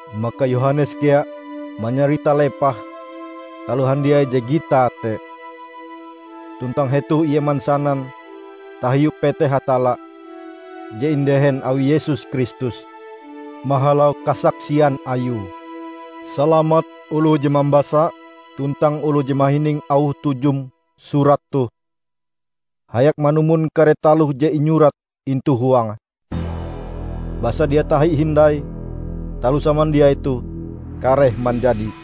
Maka Yohanes kea manyarita lepah taloh handiai je gitae te; tuntang hetoh ie mansanan tahiu peteh Hatalla je indehen awi Yesus Kristus mahalau kasaksian ayue. Salamat oloh je mambasa tuntang oloh je mahining auh tujum surat toh hayak manumon kare taloh je inyurat intu huange. Basa dia tahi hindai taloh samandiai toh kareh manjadi.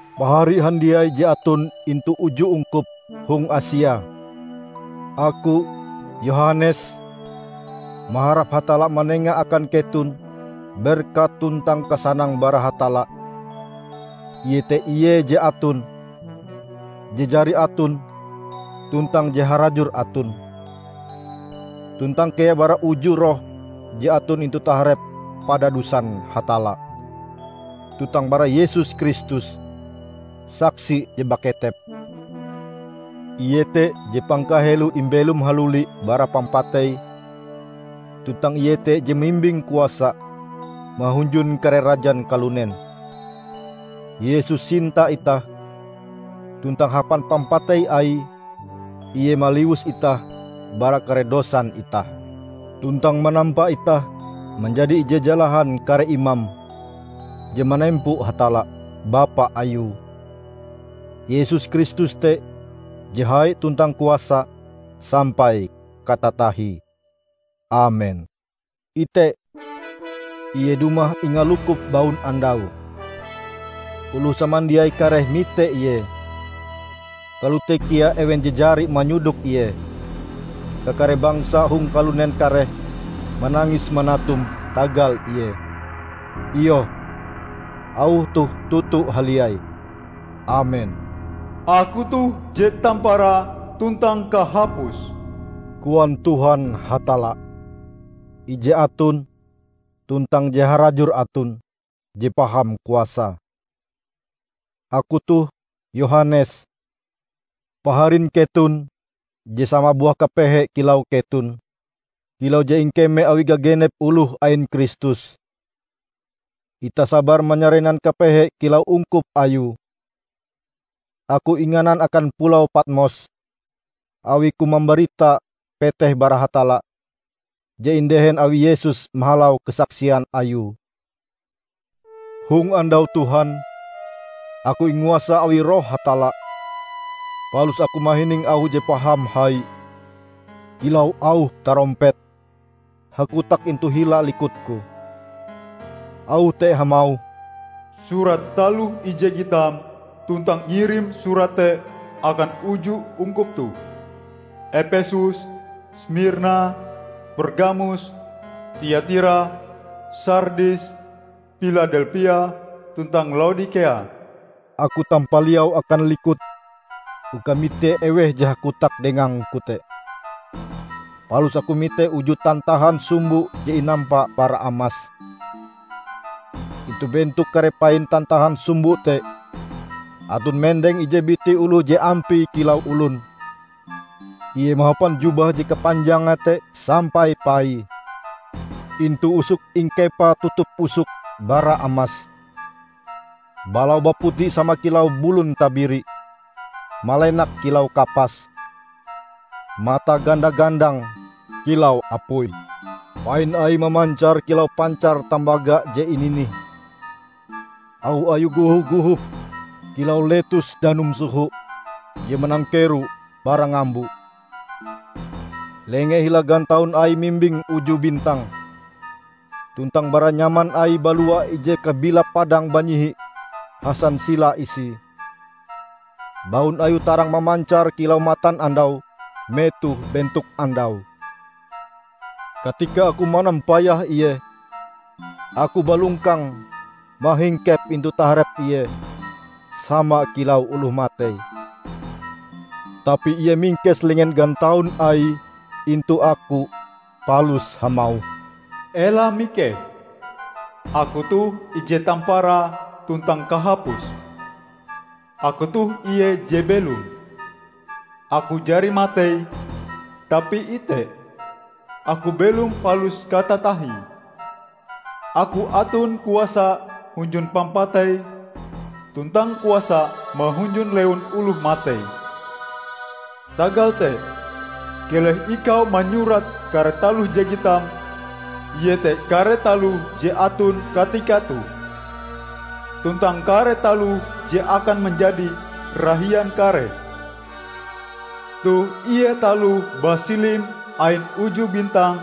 Pahari handiai je aton intu uju ungkup hong Asia! Aku, Yohanes, maharap Hatalla manenga akan keton berkat tuntang kasanang bara Hatalla iete Ie Je Aton, Je Jari Aton, tuntang Je Harajur Aton -- tuntang kea bara uju roh je aton intu taharep padadusan Hatalla, tuntang bara Yesus Kristus, saksi je baketep. Ie te je pangkaheloe imbelom haluli bara pampatei tuntang Ie te je mimbing kuasa mahunjun kare rajan kalunen. Yesus sinta itah, tuntang hapan pampatei Aie Ie maliwus itah bara kare dosan itah, tuntang manampa itah manjadi ije jalahan kare imam, je manempo Hatalla, Bapa Ayue. Yesus Kristus te je hai tuntang kuasa sampai katatahie. Amen! Ite, Ie dumah ingalukup baunandau! Oloh samandiai kareh mite Ie, kalote kea ewen je jari manyodok Ie. Kakare bangsa hong kalunen kareh manangis manatum tagal Ie. Iyoh, auh toh toto haliai! Amen! "Aku toh je tamparae tuntang kahapuse," koan Tuhan Hatalla, Ije Aton, tuntang Je Harajur Aton, Je Paham Kuasae. Aku toh Yohanes, paharin keton je sama buah kapehe kilau keton, kilau je ingkeme awi gagenep oloh ain Kristus. Itah sabar manyarenan kepehe kilau ungkup Ayue. Aku inganan akan pulau Patmos awiku mambarita peteh bara Hatalla, je indehen awi Yesus mahalau kasaksian Ayue. Hong andau Tuhan, aku inguasa awi Roh Hatalla, palus aku mahining auh je paham hai -- kilau auh tarompet -- hakotak intu hila likutku. Auh te hamauh, "Surat taloh ije gitam, tuntang ngirim surat te akan uju ungkup toh: Epesus, Smirna, Pergamus, Tiatira, Sardis, Piladelpia, tuntang Laodikea." Aku tampaliau akan likut uka mite eweh je hakotak dengangku te. Palus aku mite uju tantahan sumbo je inampa bara amas. Intu bentok kare pain tantahan sumbo te aton mendeng ije biti oloh je ampie kilau olon. Ie mahapan jubah je kapanjange te sampai paie. Intu usoke ingkepae tutup usok bara amas. Balaue baputi sama kilau bulun tabiri, malenak kilau kapas. Matae ganda-gandang kilau apui; pain Aie mamancar kilau pancar tambaga je ininih. Auh Ayue goho-gohop kilau letus danum soho je manangkero bara ngambo. Lengee hila gantaun Aie mimbing uju bintang, tuntang bara nyaman Aie balua ije kabilap padang banyihi hasansila isie. Baun Ayue tarang mamancar kilau matanandau metoh bentok andau. Katika aku manampayah Ie, aku balongkang mahingkep intu taharep Ie sama kilau oloh matei. Tapi Ie mingkes lenge gantaun Aie intu aku palus hamauh, "Ela mikeh! Aku toh ije tamparae tuntang kahapuse. Aku toh Ie je belom! Aku jari matei, tapi ite, Aku belom palus katatahie. Aku aton kuasa hunjun pampatei, tuntang kuasa mahunjun lewun oloh matei. Tagal te, keleh ikau manyurat kare taloh je gitam, iete kare taloh je aton katika toh, tuntang kare taloh je akan manjadi rahian kareh. Toh ie taloh basilim ain uju bintang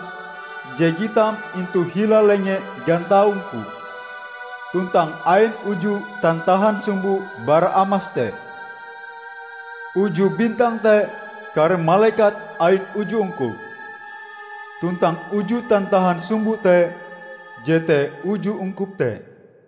je gitam intu hila lenge gantaung-Ku, tuntang ain uju tantahan sumbo bara amas te: Uju bintang te kare malekat ain uju ungkup, tuntang uju tantahan sumbo te jete uju ungkup te."